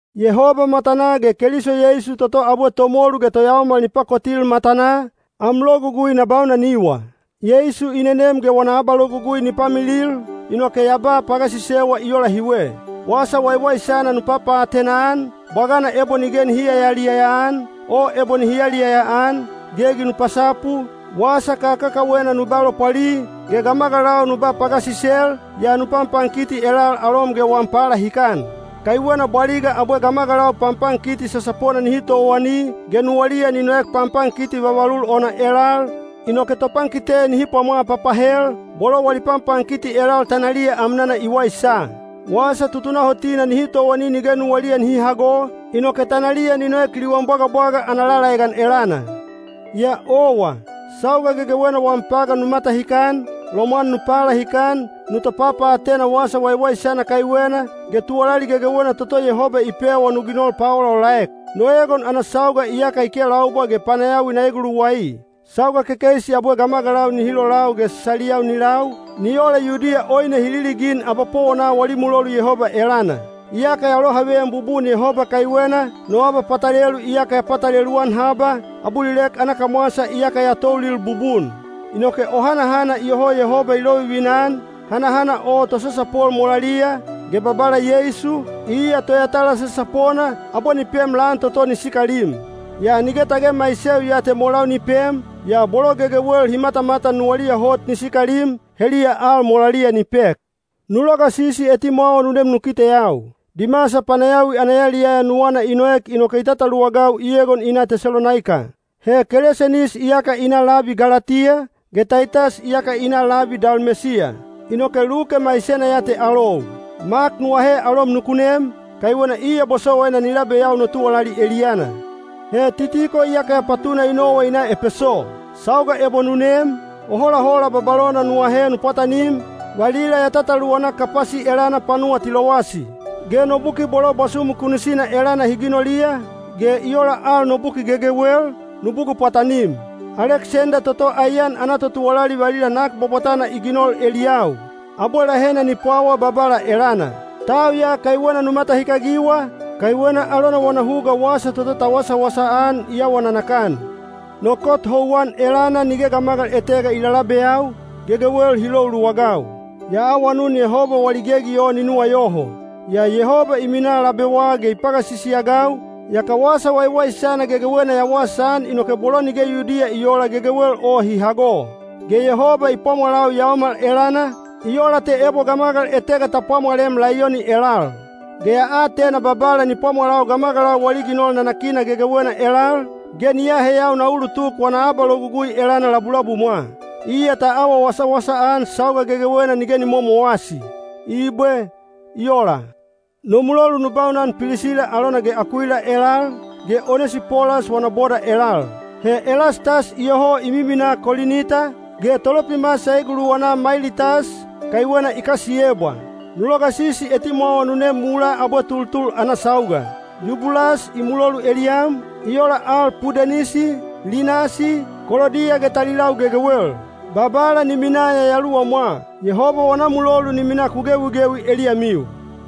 Yehoba matanaa ge Keliso Yeisu toto abwe tomolu ge toyaomal ni pakotil matanaa, am logugui na baunaniwa. Yeisu i nenem ge wana abalogugui ni pamilil, inoke ya ba pagasisewa i ola hiwe: Wasa Waiwaisana nu papaatena-an, bwagana ebo nige nihi yaliyaya-an, o ebo nihi yaliyaya-an. Gegi nu pasapu, wasa kakakawena nu ba lopwali, ge gamagalau nu ba pagasisel, yaa nu panpankiti elal alom ge wam palahikan. Kaiwena bwaliga abwe gamagalau panpankiti sasapona nihi towani, ge nuwaliya ni noek panpankiti vavalul ona elal, inoke topankite nihi pwamwa papahel, bolo wali panpankiti elal tanaliya amnana i waisa. Wasa tutunahotina nihi towani nige nuwaliya nihi hago, inoke tanaliya ni noek liwan bwagabwaga ana lalaegan elana. Yaa owa, sauga gegewena wam pagan nu matahikan, lomwan nu palahikan, nu topapaatena Wasa Waiwaisana kaiwena, ge tuwalali gegewena toto Yehoba i pewa nu ginol paolaolaek. No egon ana sauga iyaka i kelaubwa ge panayawi na eguluwai. Sauga kekeisi abwe gamagalau nihi lolau ge saliyau ni lau, ni ola Yudiya oine hi liligin abapowona wali mulolu Yehoba elana. Iyaka ya lohaveyan bubun Yehoba kaiwena, no abapatalelu iyaka ya patalelu-an haba, abulilek ana kamwasa iyaka ya toulil bubun. Inoke o hanahana iyoho Yehoba i lovivina-an, hanahana o tosasapol molaliya, ge Babala Yeisu, iya toyatala sasapona, abwe ni pem lan toto ni sikalim. Yaa nige tage maiseu ya te molau ni pem, yaa bolo gegewel hi matamatan nuwaliya hot ni sikalim, heliya al molaliya ni pek. Nu logasisi etimwawa nu nem nu kiteyau. Dimasa panayawi ana yaliyaya nuwana i noek inoke i tataluwagau i egon i na Tesalonaika. He Kelesenis iyaka i na labi Galatiya, ge Taitas iyaka i na labi Dalmesiya, inoke Luke maisena ya te alou. Mak nu ahe alom nuku nem, kaiwena iya bosowaina ni labeyau no tuwalali eliyana. He Titiko iyaka ya patuna i nowa i na Epeso. Sauga ebo nu nem, o holahola babalona nu ahe nu pwatanim, valila ya tataluwana Kapasi elana panuwa Tilowasi. Ge no buki bolo bwasumu kunisina elana hi ginoliya, ge i ola al no buki gegewel, nu bugul pwatanim. Aleksenda toto aiyan ana totuwalali valila nak bwabwatana i ginol eliyau. Abwe lahena ni pwawa Babala elana. Tau ya kaiwena nu matahikagiwa, kaiwena alona wana huga wasa toto ta wasawasa-an i awa nanakan. No kot houwan elana nige gamagal etega i lalabeyau, gegewel hi lou luwagau. Ya awanun Yehoba wali gegi o ni nuwayoho. Yaa Yehoba i minaa labewa ge i pagasisi-agau, yaka Wasa Waiwaisana gegewena ya wasaan inoke bolo nige Yudiya i oola gegewel o hi hago. Ge Yehoba i pwamwalau yaomal elana, i ola te ebo gamagal etega ta pwamwalem laiyoni elal. Ge ya atena Babala ni pwamwalau gamagalau wali ginol nanakina gegewena elal, ge ni aheyau na ulutuk wana abalogugui elana labulabumwa. Iya ta awa wasawasa-an sauga gegewena nige ni momowasi. Ibwe. I ola. No mulolu nu baunan Pilisila alona ge Akuila elal, ge Onesipolas wana boda elal. He Elastas iyoho i miminaa Kolinita, ge Tolopimas ya eguluwana Mailitas, kaiwena i kasiyebwa. Nu logasisi etimwawa nu nem mulaa abwe tultul ana sauga. Yubulas i mulolu eliyam, i ola al Pudenisi, Linasi, Kolodiya ge talilau gegewel. Babala ni minaa yayaluwamwa. Yehoba wana mulolu ni minaa ku gewigewi eliyamiu.